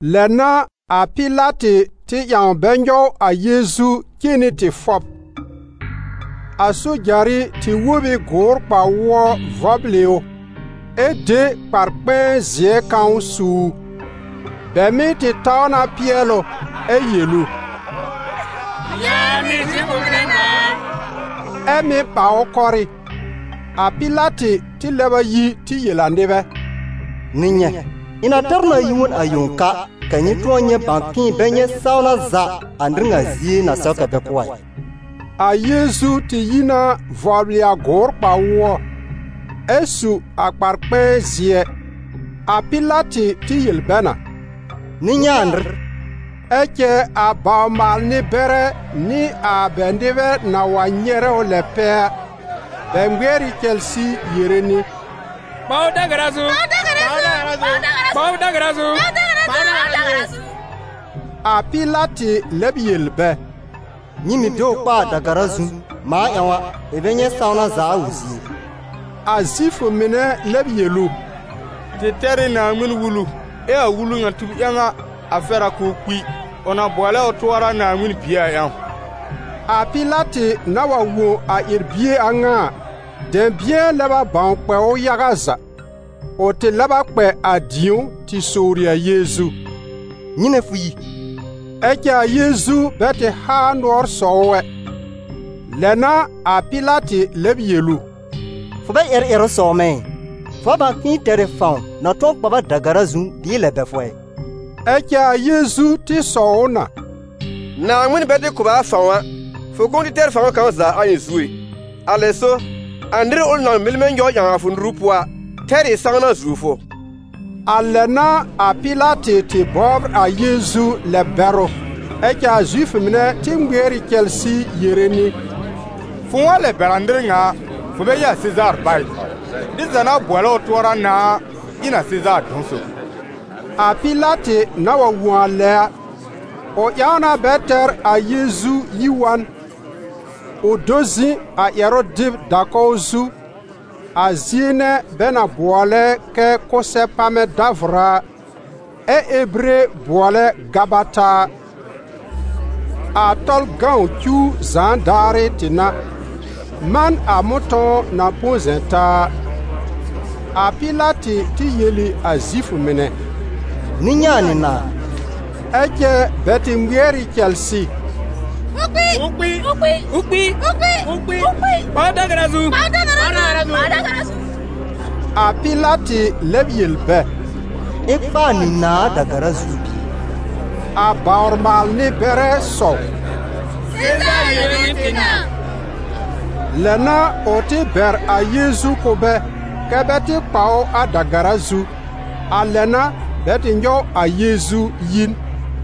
Lɛ n'a a Pɩlatɩ tɩ ƴãw bɛ nyɔw a Yeezu cen nɩ tɩ fɔb. A sojarɩ tɩ wób ɩ gʋʋr kpa-wʋɔ vɔblɩ ʋ, ɛ de kpar-kpɛ̃ɛ zɩɛ kãw su ʋ. Bɛ mɩ́ tɩ taw na pɩɛl ʋ, ɛ yel ʋ: «Yaanɩ, Zifʋ mɩnɛ nãà a!» Ɛ́ mɩ́ ɓa ʋ kɔrɩ́. A Pɩlatɩ tɩ lɛb a yi tɩ yel a nɩbɛ: «Nyɩ nyɛ̃, ɩ̃ na tɛr ʋ na yi wa n a yẽw ka, kɛ́ nyɩ tʋ̃ɔ nyɛ̃ bãw k'ɩ̃ɩ bɛ nyɛ̃ sãwna za a nɩr ŋa zie na sɛw kɛ́ bɛ kʋ́ a ɩ.» A Yeezu tɩ yi na vɔblɩ a gʋʋr kpa-wʋɔ, ɛ su a kpar-kpɛ̃ɛ zɩɛ. A Pɩlatɩ tɩ yel bɛ na: «Nyɩ nyɛ̃ a nɩr!» Ɛ cɛ a bawr-maal-nɩ-bɛrɛ nɩ a bɛ nɩbɛ na wa nyɛrɛ ʋ lɛ pɛ a, bɛ ŋmɩɛr ɩ cɛlsɩ yere nɩ: «Kpa ʋ da-gara zu! Kpa ʋ da-gara zu!» A Pɩlatɩ lɛb yel bɛ: «Nyɩ mɩ̀ de ʋ kpa a da-gara zu, mãa ƴãw a, ɩ̃ bɛ nyɛ̃ sãwna za a ʋ zie ɩ.» A Zifʋ mɩnɛ lɛb yel ʋ: «Tɩ tɛr ɩ Naaŋmɩn-Wulu, ɛ a wulu ŋa tub ƴãw a, a fɛr a k'ʋʋ kpi: ʋ na bʋɔlɛ ʋ tʋɔra Naaŋmɩn Bie a ƴãw!» A Pɩlatɩ na wa wõ a ƴɛr-bie a ŋa a, dɛ̃bɩ̃ɛ lɛb a bãw kpɛ ʋ yaga za. Ʋ tɩ lɛb a kpɛ a dĩ̀ó tɩ sowri a Yeezu: «Nyɩnɛ fʋ yi?» Ɛ cɛ a Yeezu bɛ tɩ haa nʋɔr sɔw ʋ ɛ. Lɛ n'a a Pɩlatɩ lɛb yel ʋ: «Fʋ bɛ ƴɛrɛ ƴɛrʋ sɔwr mɛ̃ ɩ? Fʋ bɛ bãw k'ɩ̃ɩ tɛr ɩ fãw na tʋ̃ɔ kpa b a da-gara zu, bɩɩ lɛb bɛr fʋ ɛ?» Ɛ cɛ a Yeezu tɩ sɔw ʋ na: «Naaŋmɩn bɛ tɩ kʋ̀ b a fãw a, fʋ kʋ̃ʋ tɩ tɛr fãw kãw za a ɩ̃ zu ɛ. Alɛ so, a nɩr ʋl na mɩl mɛ̃ nyɔw ƴãw a fʋ nuru pʋɔ a tɛr ɩ sãwna zuo fʋ.» A lɛ n'a a Pɩlatɩ tɩ bɔbr a Yeezu lɛb-bɛrʋ. Ɛ cɛ a Zifʋ mɩnɛ tɩ ŋmɩɛr ɩ cɛlsɩ yere nɩ: «Fʋ̃ʋ wa lɛb bɛr a nɩr ŋa a, fʋ bɛ ɩ a Sezaar bá ɩ! Nɩr za na bʋɔlɛ ʋ tʋɔra nãà a ɩ n a Sezaar dɔ̃-sob.» A Pɩlatɩ na wa wõ a lɛ a, ʋ ƴãw na bɛ tɛr a Yeezu yi wa n; ʋ do zɩ̃ a ƴɛrʋ-dɩb da-kɔw zu, a zie nɛ bɛ na bʋɔlɛ kɛ Kʋsɛ-pamɛ-davʋra a, ɛ Ebire bʋɔlɛ Gabata a. A Tɔlʋ cuw zãa daarɩ tɩ n'a, man a mʋ̃tɔ̃w na põ zɛ̃ taa a. A Pɩlatɩ tɩ yel ɩ a Zifʋ mɩnɛ: «Nyɩ nyɛ̃ a nyɩ nãà!» Ɛ cɛ bɛ tɩ ŋmɩɛr ɩ cɛlsɩ: «Ʋ kpi! Ʋ kpi! Kpa ʋ da-gara zu!» A Pɩlatɩ lɛb yel bɛ: «Ɩ̃ kpa a nyɩ nãà a da-gara zu bɩɩ?» A bawr-maal-nɩ-bɛrɛ sɔw: «Sezaar yõ n'ɩ tɩ nãà.» Lɛ n'a ʋ tɩ bɛr a Yeezu kʋ̀ bɛ kɛ́ bɛ tɩ kpa ʋ a da-gara zu. A lɛ n'a bɛ tɩ nyɔw a Yeezu yi n.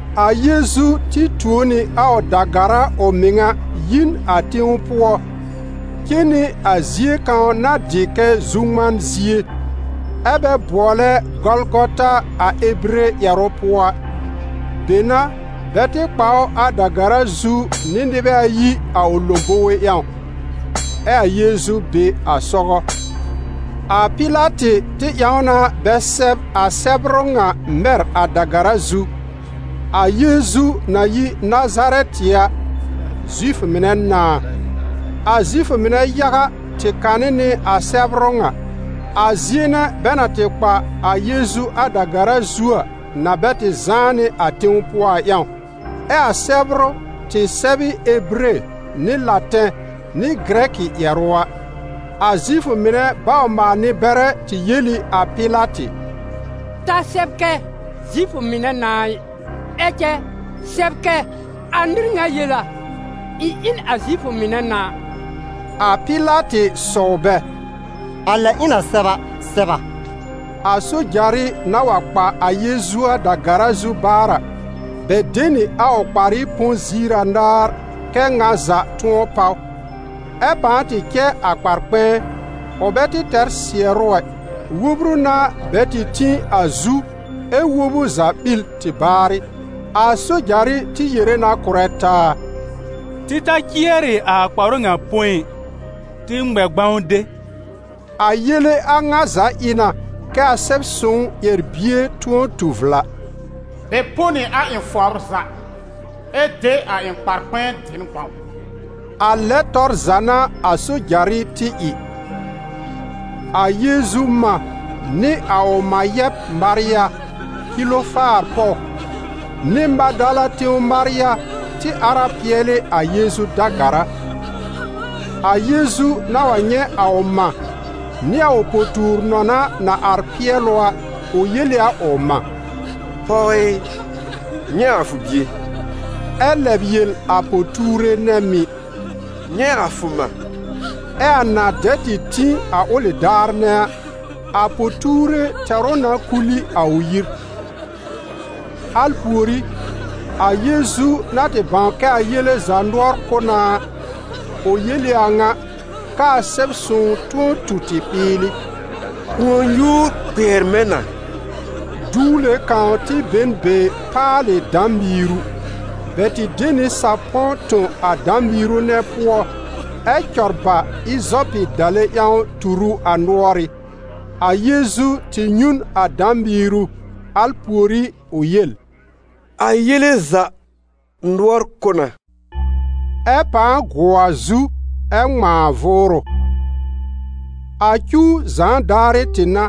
A Yeezu tɩ tuo nɩ a ʋ da-gara ʋ mɩŋa yi n a tẽw pʋɔ, cen nɩ a zie kãw na dɩ kɛ Zu-ŋman-zie, ɛ́ bɛ bʋɔlɛ Gɔlgɔta a Ebire ƴɛrʋ pʋɔ a. Be n'a bɛ tɩ kpa ʋ a da-gara zu nɩ nɩbɛ ayi a ʋ lõbowe ƴãw, ɛ a Yeezu be a sɔgɔ. A Pɩlatɩ tɩ ƴãw na bɛ sɛb a sɛbrʋ ŋa mɛr a da-gara zu: «A Yeezu na yi Nazarɛtɩ a, Zifʋ mɩnɛ nãà.» A Zifʋ mɩnɛ yaga tɩ kanɩ nɩ a sɛbrʋ ŋa. A zie nɛ bɛ na tɩ kpa a Yeezu a da-gara zu a na bɛ tɩ zãá nɩ a tẽw pʋɔ a ƴãw, ɛ a sɛbrʋ tɩ sɛb ɩ Ebire nɩ Latɛ̃ nɩ Gɩrɛkɩ ƴɛrʋ a. A Zifʋ mɩnɛ bawr-maal-nɩ-bɛrɛ tɩ yel ɩ a Pɩlatɩ: «Ta sɛb kɛ: ‹Zifʋ mɩnɛ nãà ɩ›, ɛ cɛ sɛb kɛ: ‹A nɩr ŋa yel a: ɩ̃ ɩ n a Zifʋ mɩnɛ nãà.›» A Pɩlatɩ sɔwl bɛ: «A lɛ ɩ̃ na sɛb a, sɛb na.» A sojarɩ na wa kpa a Yeezu a da-gara zu baar a, bɛ de nɩ a ʋ kparɩ põ ziir anaar, kɛ́ ŋa za tʋ̃ɔ páw. Ɛ pãa tɩ cɛ a kpar-kpɛ̃ɛ: ʋ bɛ tɩ tɛr sɩɛrʋ ɛ, wobru n'a bɛ tɩ tĩ a zu ɛ wob ʋ za ɓil tɩ baarɩ. A sojarɩ tɩ yere na kʋ̀rɛ taa: «Tɩ ta cɩɛrɩ a kparʋ ŋa põ ɩ, tɩ ŋmɛ gbãw de.» A yele a ŋa za ɩ na, kɛ a Sɛb-sõw ƴɛr-bie tʋ̃ɔ tu vla: «Bɛ põ nɩ a ɩ̃ fɔbr za, ɛ de a ɩ̃ kpar-kpɛ̃ɛ dɩ n gbãw.» A lɛ tɔr za n'a a sojarɩ tɩ ɩ. A Yeezu mã nɩ a ʋ mã yɛb Marya, Kilofaar pɔw, nɩ Madala tẽw Marya tɩ ar a pɩɛlɩ a Yeezu da-gara. A Yeezu na wa nyɛ̃ a ʋ mã nɩ a ʋ po-tuur-nɔna na ar pɩɛl ʋ a, ʋ yel ɩ a ʋ mã: «Pɔw ɩ, nyɛ̃ a fʋ bie.» Ɛ lɛb yel a po-tuure nɛ mɩ̀: «Nyɛ̃ a fʋ mã.» Ɛ a na dɛ tɩ tĩ a ʋlɩ daar nɛ a, a po-tuure tɛr ʋ na kul ɩ a ʋ yir. Al pùorí, a Yeezu na tɩ bãw kɛ a yele za nʋɔr kʋ́ na a, ʋ yel ɩ a ŋa, k'aa Sɛb-sõw tʋ̃ɔ tu tɩ ɓɩɩlɩ: «Kʋ̃ɔ-nyuur kpɩɛr mɛ̃ na.» Duwle kãw tɩ be n be paalɩ dã-miiru. Bɛ tɩ de nɩ sapɔ̃ tõ a dã-miiru nɛ pʋɔ ɛ cɔr ba ɩzɔpɩ dale ƴãw tur ʋ a nʋ́ɔrɩ́. A Yeezu tɩ nyũ n a dã-miiru, al pùorí ʋ yel: «A yele za nʋɔr kʋ́ na!» Ɛ pãa gʋɔ a zu, ɛ ŋmãa vʋʋrʋ. A cuw zãa daarɩ tɩ n'a.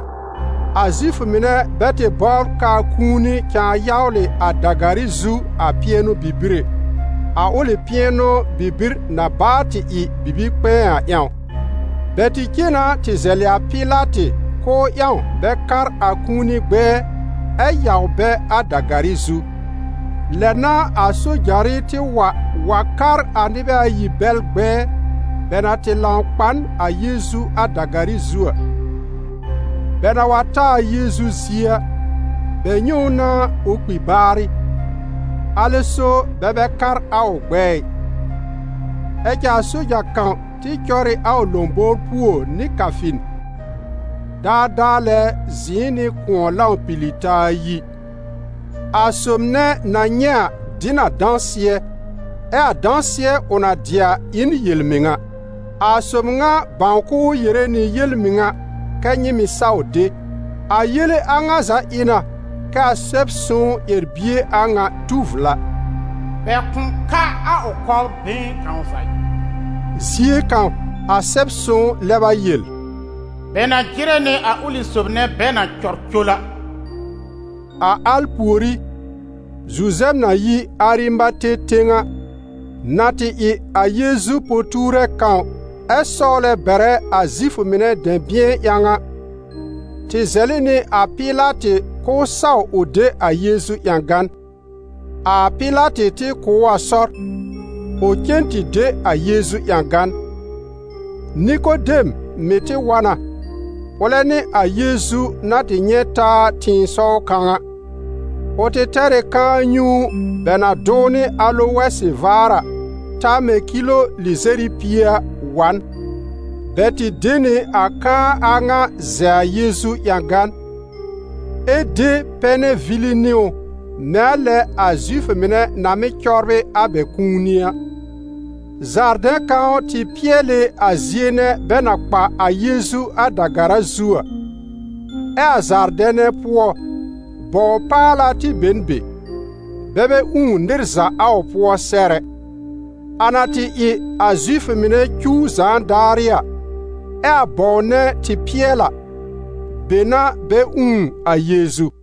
A Zifʋ mɩnɛ bɛ tɩ bɔbr k'aa kũuni cãa yawlɩ a da-garɩ zu a pɩɛnʋ-bibir ɛ, a ʋlɩ pɩɛnʋ-bibir na baa tɩ ɩ bibi-kpɛ̃ɛ a ƴãw. Bɛ tɩ cen na tɩ zɛlɩ a Pɩlatɩ k'ʋʋ ƴãw bɛ kar a kũuni gbɛɛ, ɛ yaw bɛ a da-garɩ zu. Lɛ n'a a sojarɩ tɩ wa wa kar a nɩbɛ ayi bɛl gbɛɛ, bɛ na tɩ lãw kpa n a Yeezu a da-garɩ zu a. Bɛ na wa ta a Yeezu zie a, bɛ nyɛ̃ ʋ na ʋ kpi baarɩ; alɛ so bɛ bɛ kar a ʋ gbɛɛ ɩ. Ɛ cɛ a soja kãw tɩ cɔr ɩ a ʋ lõbowr puo nɩ kafin. Daadaa lɛ zɩ̃ɩ nɩ kʋ̃ɔ lãw pili taa yi. A sob nɛ na nyɛ̃ a dɩ n a dãsɩɛ, ɛ a dãsɩɛ ʋ na dɩ a ɩ n yel-mɩŋa. A Sob ŋa bãw k'ʋʋ yere nɩ yel-mɩŋa kɛ́ nyɩ mɩ̀ saw de. A yele a ŋa za ɩ na kɛ a Sɛb-sõw ƴɛr-bie a ŋa tu vla: «Bɛ kʋ̃ ka a ʋ kɔbr been kãw za ɩ.» Zie kãw, a Sɛb-sõw lɛb a yel: «Bɛ na jɩrɛ nɩ a ʋlɩ sob nɛ bɛ na cɔr col a.» A al pùorí, Zuzɛb na yi Arimate tẽw a, na tɩ ɩ a Yeezu po-tuure kãw ɛ sɔwlɛ bɛrɛ a Zifʋ mɩnɛ dɛ̃bɩ̃ɛ ƴãw a, tɩ zɛlɩ nɩ a Pɩlatɩ k'ʋʋ saw ʋ de a Yeezu ƴãgan. A Pɩlatɩ tɩ kʋ̀ ʋ a sɔr, ʋ cen tɩ de a Yeezu ƴãgan. Nikodem mɩ̀ tɩ wa na, ʋlɛ nɩ a Yeezu na tɩ nyɛ̃ taa tɩ̃ɩsɔw kãw a. Ʋ tɩ tɛr ɩ kãa-nyũu bɛ na dʋw nɩ alowɛsɩ vaar a, ta mɛ̃ kilo lɩzɛr ɩ pie a, wa n. Bɛ tɩ de nɩ a kãa a ŋa zɛ a Yeezu ƴãgan, ɛ de pɛnɛ vili nɩ ʋ mɛ̃ a lɛ a Zifʋ mɩnɛ na mɩ́ cɔbrɩ a bɛ kũuni a. Zaardɛ̃ kãw tɩ pɩɛl ɩ a zie nɛ bɛ na kpa a Yeezu a da-gara zu a. Ɛ a zaardɛ̃ nɛ pʋɔ, bɔw-paala tɩ be n be, bɛ bɛ ũù nɩr za a ʋ pʋɔ sɛr ɛ. A na tɩ ɩ a Zifʋ mɩnɛ cuw zãa daarɩ a, ɛ a bɔw nɛ tɩ pɩɛl a, be n'a bɛ ũù a Yeezu.